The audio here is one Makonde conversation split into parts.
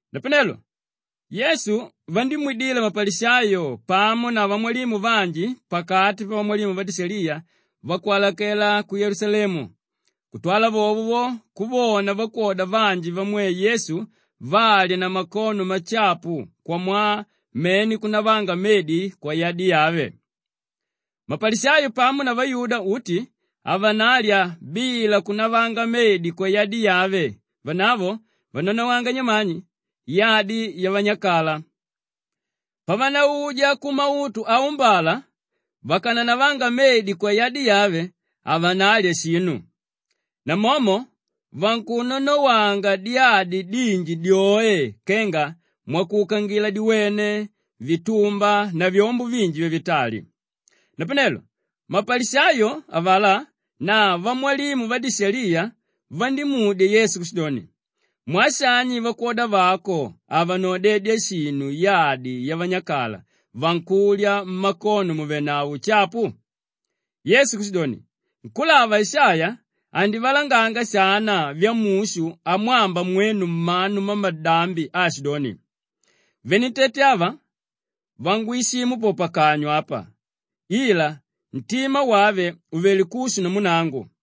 Napanelo Yesu vandímwidila mapalishayo pamo na vamwalimu vanji pakati pavamwalimu vadishaliya vakwalakela ku Yelusalemu kutwala vovo vo kuvona vakwoda vanji vamwe Yesu valya na makono mashapu kwamwaa mene kunavanga medi kwayadi yave. Mapalishayo pamo na vayuda uti havanalya bila kunavanga medi kwayadi yave, vanavo vananawanga nyamani, yadi yavanyakala. Pavanauja kumautu aumbala vakananavanga medi kwayadi yave, havanalya shinu. Namomo vankunanawanga diyadi dinji dyoe kenga mwakuukangila diwene, vitumba na vyombo vinji vyavitali. Napanelo mapalishayo avalá na vamwalimu vadishaliya vandímudya Yesu kushidoni, “Mwaa shani vakwoda vako havanaodedya shinu yadi yavanyakala, vankulya mmakono mùvenavo ushapu?” Yesu kushidoni, “Nkúlava Ishaiya andivalanganga shana vyamushu amwamba mwenu mmanu mmamalambi aashidoni, “ ‘Venentete ava vangwishimu po pakanywa apa, ila ntima wave uvelé kushu namu nangu.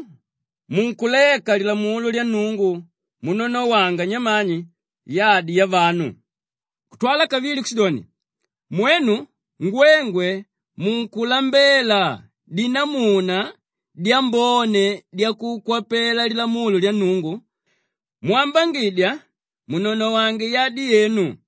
Mwenu munkuleka lilamulo lya Nnungu munanawanga nyamani, yadi yavanu.” Kutwala kavili kushidoni, “Mwenu ngwengwe munkulambela dinamuna dyambone dyakukwapela lilamulo lya Nnungu mwambangidya munanawange yadi yenu.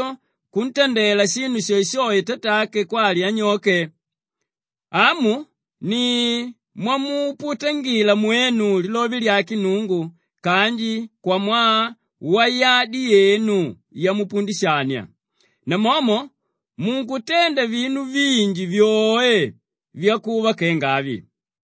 bai mwenu munkunneya munu ajo kuntandela shinu shoeshoe tatake kwali anyoke. Amu ni mwamuputangila mwenu lilove lyake Nnungu kanji kwamwaa wayadi yenu yamupundishania. Namomo munkutenda vinu vinji vyoe vyakuva kenga avi.”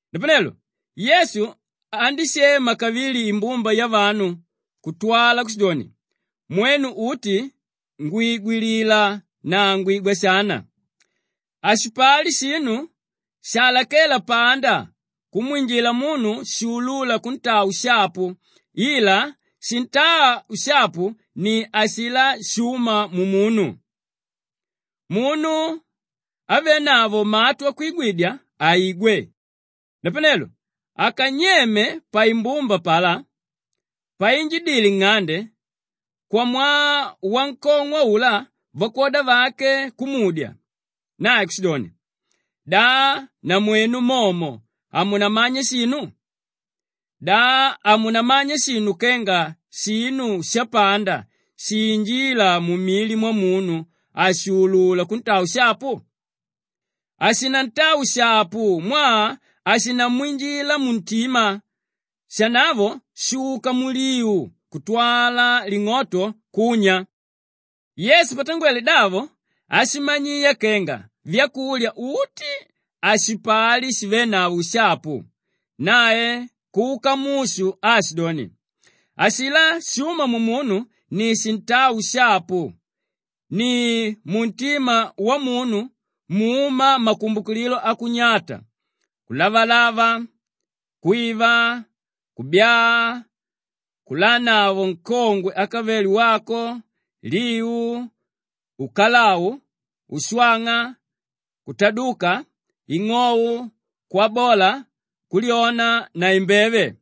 Napanelo Yesu andíshema kavili imbumba yavanu kutwala kushidoni, “Mwenu uti ngwigwilila na ngwigwa shana. Hashipali shinu shalakéla panda kumwinjila munu shuulúla kuntaa ushapu ila shintáa ushapu ni ashilá shúma mumunu. Munu ávenavo matu akwigwidya, aigwe.” Napanelo akanyeme paimbumba apalá, painjidile nng'ande, kwamwaa wankong'o aulá vakwoda vake kumudya. Nae kushidoni, “Da namwenu momo hamunamanya shinu? Da hamunamanya shinu kenga shinu shapanda shiinjíla mumili mwamunu hashuulula kuntaa ushapu? Hashinantaa ushapu mwaa hashinamwinjila muntima, shanavo shuka muliu kutwala ling'oto kunya.” Yesu patangwele davo ashimanyiya kenga vyakulya uti hashipali shivénavo ushapu. Nae kuka mushu aashidoni, “Ashilá shúma mumunu ni shintáa ushapu. Ni muntima wamunu múma makumbukililo akunyata; kulavalava, kwiva, kubyaa, kulanavo nkongwe ákavele wako, liu, ukalau, ushwang'a, kutaduka, ing'ou, kwabola, kulyona na imbeve.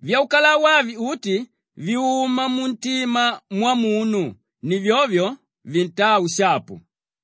Vyaukalau avi uti vyuma muntima mwamunu; ni vyovyo vintáa ushapu.”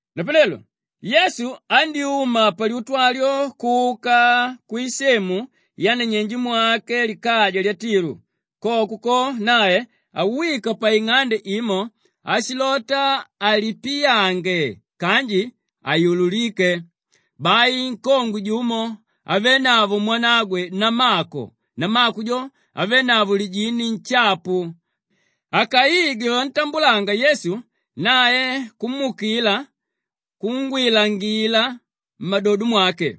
Napanelo Yesu andyúma palyutu alyo kuka kwisemu yananyenje mwake likaja lya Tilu. Koko ko, nae awika paing'ande imo ashilota alipiyange kanji haiyululíke. Bai nkongwe jumo ávenavo mwanagwe namako, namako jo ávenavo lijini nshapu, akaigwe vantambulanga Yesu, nae kumuukila kungwilangila mmadodo mwake.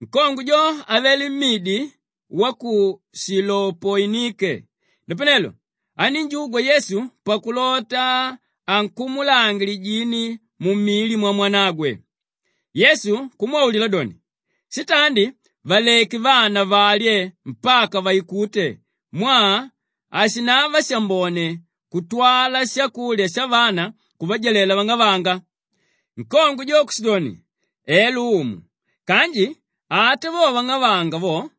Nkongwe jo avele mmidi wa ku Shilopoinike; napanelo anínjugwa Yesu pakulota ankumulange lijini mumili mwamwanagwe. Yesu kumwaulila doni, “Shitandi valeke vana valye mpaka vaikute mwaa hashinava shambone kutwala shakulya shavana kuvajalela vang'avanga.” Nkongwe jo kushidoni, “Elo Umu kanji ata vo vang'avanga vo,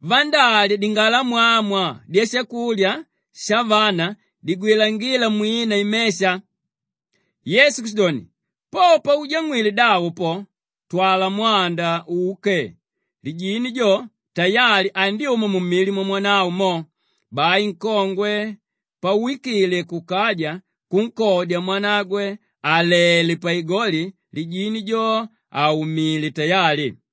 vandálya dingalamwamwa dyashakulya shavana digwilangíla mwina imesha.” Yesu kushidoni, “Po paujang'wile davo po, twala mwanda uke, lijini jo, tayali andyuma mumili mwamwanavo mo.” Bai nkongwe pawikile kukaja kunkodya mwanagwe àlele paigoli, lijini jo àmuumile tayali.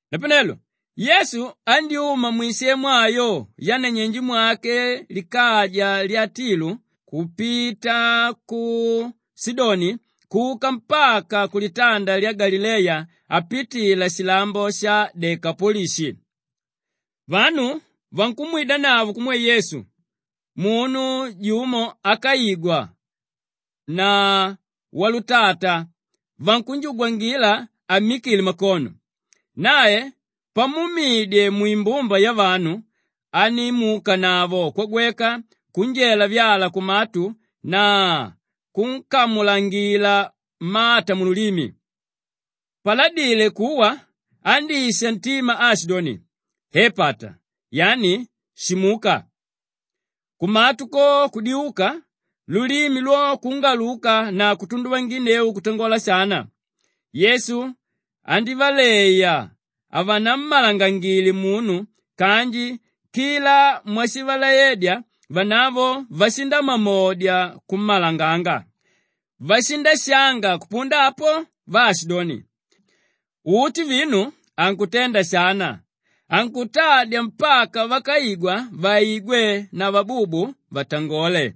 Napanelo Yesu andyúma mwisemu ayo yananyenje mwake likaja lya Tilu kupita ku Shidoni kuka mpaka kulitanda lya Galileya apitila shilambo sha Dekapolishi. Vanu vankumwidanavo kumwe Yesu munu jumo ákaigwa na walutata vankunjugwangila ammikile makono. Nae pamuumidye mwimbumba yavanu, andímuukanavao kwagweka kunjela vyala kumatu na kunkamulangila mata mululimi. Paladile kuwa, andísha ntima aashidoni, “Epataa!” Yani, “Shimuka!” Kumatu ko kudiuka, lulimi lyo kungaluka na kutunduvanginneu kutangola shana. Yesu andívaleya havanammalangangile munu kanji kila mwashivalaedya vanavo vashindamamodya kummalanganga. Vashindashanga kupunda apo vaashidoni, “Uti vinu ankutenda shana, ankutadya mpaka vákaigwa vaigwe na vabubu vatangole.”